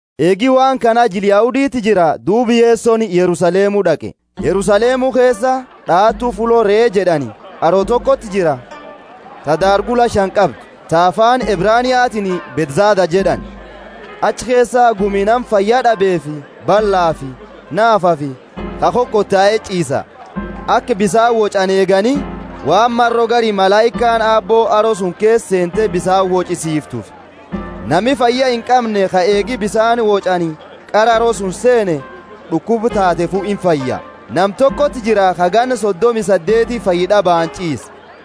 Eegi waan kana jila Yahuditi jira, duuba Yesoni Yerusalemu d'aqe. Yerusalemu keesa, d'aatu Fullo Ree jed'ani, haro tokoti jira, ta daargula shani qabdu, ta afaani Ebraniatiini Bethzatha jed'ani. Achi keesa gumi nama fayya d'abeefi ballafi naafafi ka kokotaeti ch'iisa. [Aka bisaani woch'ani eegani, waan maro gari malaikaani Aabbo haro suni keesa seente bisaani woch'isifitufi, nami fayya inqamne ka eegi bisaani woch'ani qara haro suni seene d'ukuba taatefu infaya.] Nama tokoti jira ka ganna sodomi saddeeti fayyad'abaani ch'iise.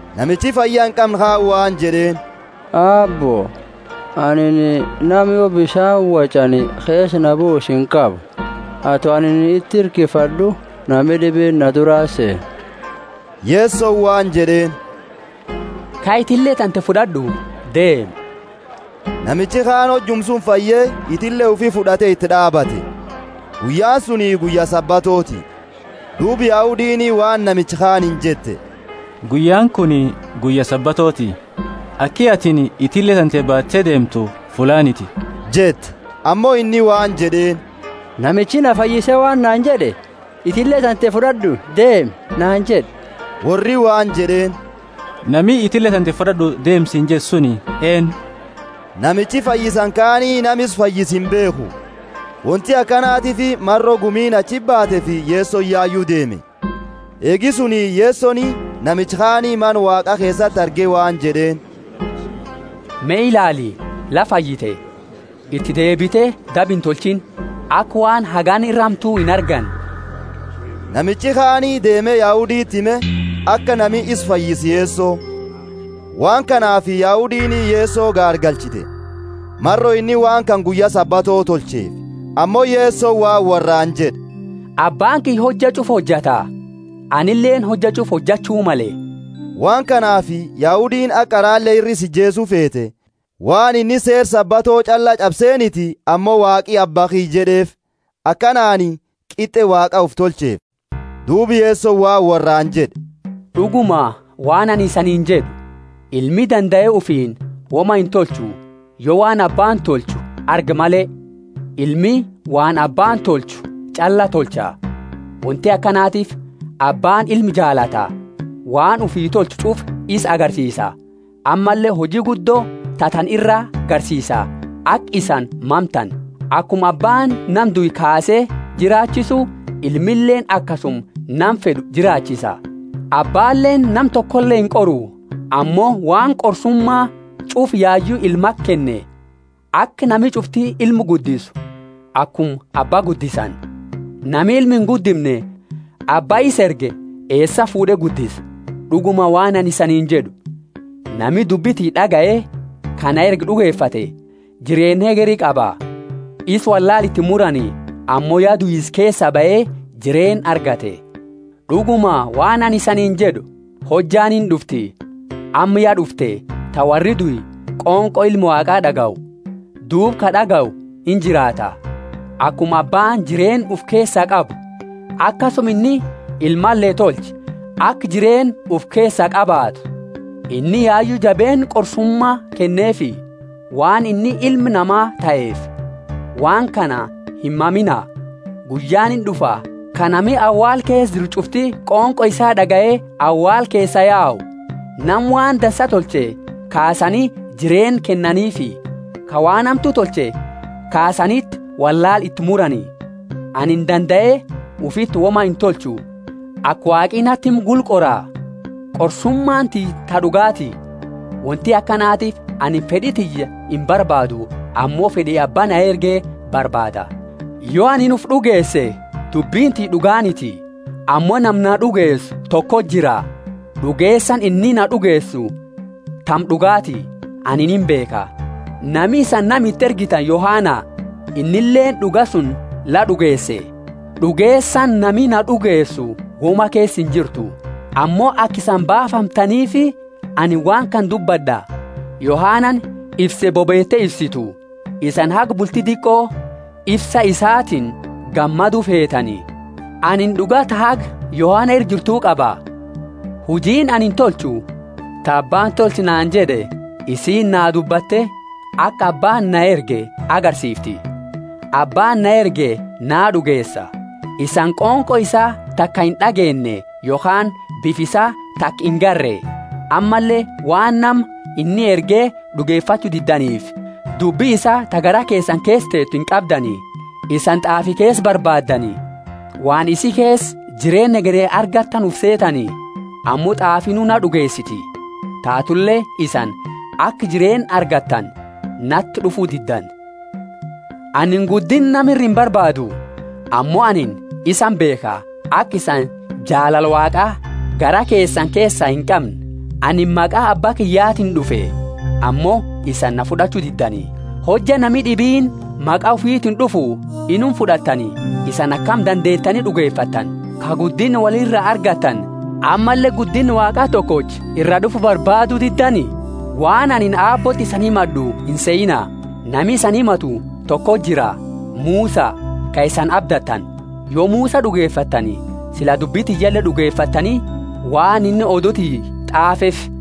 Namichi fayya inqamne kaani waan jed'eeni, Aabbo, anini nama yo bisaani woch'ani keesa na buusu inqabu; ato anini iti hirkifad'u, nami d'ibiini na durati seena. Yesoni waan jed'eeni, Kai, itille tante fud'ad'u, deemi. Namichi kaani hojuma suni fayye, itille ufi fud'ate iti d'aabate. Guyyaani suni guyya Sabatooti. Duuba Yahudiini waan namicha kaaniini jette, Guyyaani kuni guyya Sabatooti, aki atini itille tante baate deemtu fullaaniti jette. Ammo inni waan jed'eeni, Namichi na fayyise waan naani jed'e, Itille tante fud'ad'u, deemi, naani jed'e. Worri waan jed'eeni, Nami, Itille tante fud'ad'u deemi siini jed'e suni eennu? Namichi fayyisani kaani nama isa fayyise imbeekhu, wonti akanatiifi maro gumiini achiti baateefi Yesoni yayu deeme. Eegi suni Yesoni namicha kaani Mana Waaqa keesati arge waan jed'eeni, Me ilaali, la fayyite. Iti deebite daba intolchiini, aka waan hagana ira hamtu inarganne. Namichi kaani deeme Yahuditi hime, aka nami isa fayyise Yeso. Waan kanaafi Yahudiini Yeso gaargalchite, maro inni waan kana guyya Sabato tolcheefi. Ammo Yesoni waan worraani jed'e, Abbaani kiyya hojja ch'ufa hojata, anileeni hojja ch'ufa hojachu male. Waan kanaafi Yahudiini haga qarale ira isa ijeesu feete, waan inni seera Sabato ch'alla ch'abseniti ammo Waaqi Abba kiyya jed'eefi, akanaani qit'e Waaqa ufi tolcheefi. Duuba Yesoni waan worraani jed'e, D'uguma, waan anini isaniini jed'u, Ilmi dandae ufiini woma intolchu, yo waan Abbaani tolchu argu male. Ilmi waan Abbaani tolchu ch'alla tolcha. Wonti akanatiifi Abbaani ilma jaalata, waan ufi tolchu ch'ufa isa agarsiisa, ammalle huji guddo ta tana ira garsiisa, aka isani mamtani. Akuma Abbaani nama due kaase jiraachisu, Ilmileeni akasuma nama fed'u jiraachisa. Abbaaleeni nama tokole inqoru, ammo waan qorsuma ch'ufa yayu Ilmati kenne, aka nami ch'ufti Ilma guddisu akuma Abba guddisani. Nami Ilma inguddimne Abba isa erge eesaa fuud'e guddisa? D'uguma waan anini isaniini jed'u, Nami dubbi tiyya d'agaye ka na erge d'ugefate, jireenna hegeri qaba. Isa wollaala iti imurani, ammo ya duisa keesa bahe jireenna argate. D'uguma, waan anini isaniini jed'u, Hojjaani ind'ufti, amma ya d'ufte, ta worri due qonqo Ilma Waaqa d'agayu, duuba ka d'agayu injiraata. Akuma Abbaani jireenna ufi keesaa qabu, akasuma inni Ilmale tolche aka jireenna ufi keesaa qabaatu. Inni yayu jabeenna qorsuma kenneefi, waan inni Ilma Nama taheefi. Waan kana himmamiina; guyyaani ind'ufa ka nami awaala keesa jiru ch'ufti qonqo isaa d'agaye awaala keesaa yau, nama waan dansa tolche kaasani jireenna kennaniifi, ka waan hamtu tolche kaasaniti wollaala iti murani. Anini dandae ufiti woma intolchu: aka Waaqi nati himu gula qora; qorsumaani tiyya ta d'ugaati; wonti akanatiifi anini fed'i tiyya inbarbaadu ammo fed'i abba na erge barbaada. Yo anini ufi d'ugeese, dubbini tiyya d'ugaaniti. Ammo nama na d'ugeesu toko jira, d'ugeesani inni na d'ugeesu tama d'ugaati, anini imbeekha. Nami isani nama iti ergitani Yohana; innileeni d'uga suni la d'ugeese. D'ugeesani nami na d'ugeesu woma keesa injirtu, ammo aka isani baafamtaniifi, anini waan kana dubbad'a. Yohanani ifse bobeete ifsitu, isani haga bulti diqo ifsa isatiini gammadu feetani. Anini d'uga ta haga Yohana ira jirtu qaba: hujiini anini tolchu ta Abbaani Tolchi naani jed'e, isiini naa dubbatte, aka Abbaani na erge agarsiifti. Abbaani na erge naa d'ugeesa. Isani qonqo isaa taka ind'ageenne yokhaani bifa isaa taka inagarre; ammalle waan nama inni erge d'ugefachu diddaniifi, dubbi isaa ta garaa keesani keesa teetu inqabdani. Isani T'aafi keesa barbaaddani waan isi keesa jireenna hegeri argattani ufi seetani. Ammo T'aafinu naa d'ugeesiti! Taatule isani, aka jireenna argattani, nati d'ufu diddani. Anini guddinna nama iraa imbarbaadu. Ammo anini isani beekha, aka isani jaalala Waaqa garaa keesani keesa inqamne. Anini maqa Abba kiyyatiini d'ufe, ammo isani na fud'achu diddani; hojja nami d'ibiini maqa ufiitini d'ufu inuma fud'attani. Isani akami dandeetani d'ugefattani, ka guddinna wolira argattani, ammalle guddinna Waaqa tokocha iraa d'ufu barbaadu diddani? Waan anini Aabbooti isani himad'u insehiina; nami isani himatu toko jira, Musa, ka isani abdattani. Yo Musa d'ugefattani, sila dubbi tiyyale d'ugefattani, waan inni odu tiyya t'aafeefi.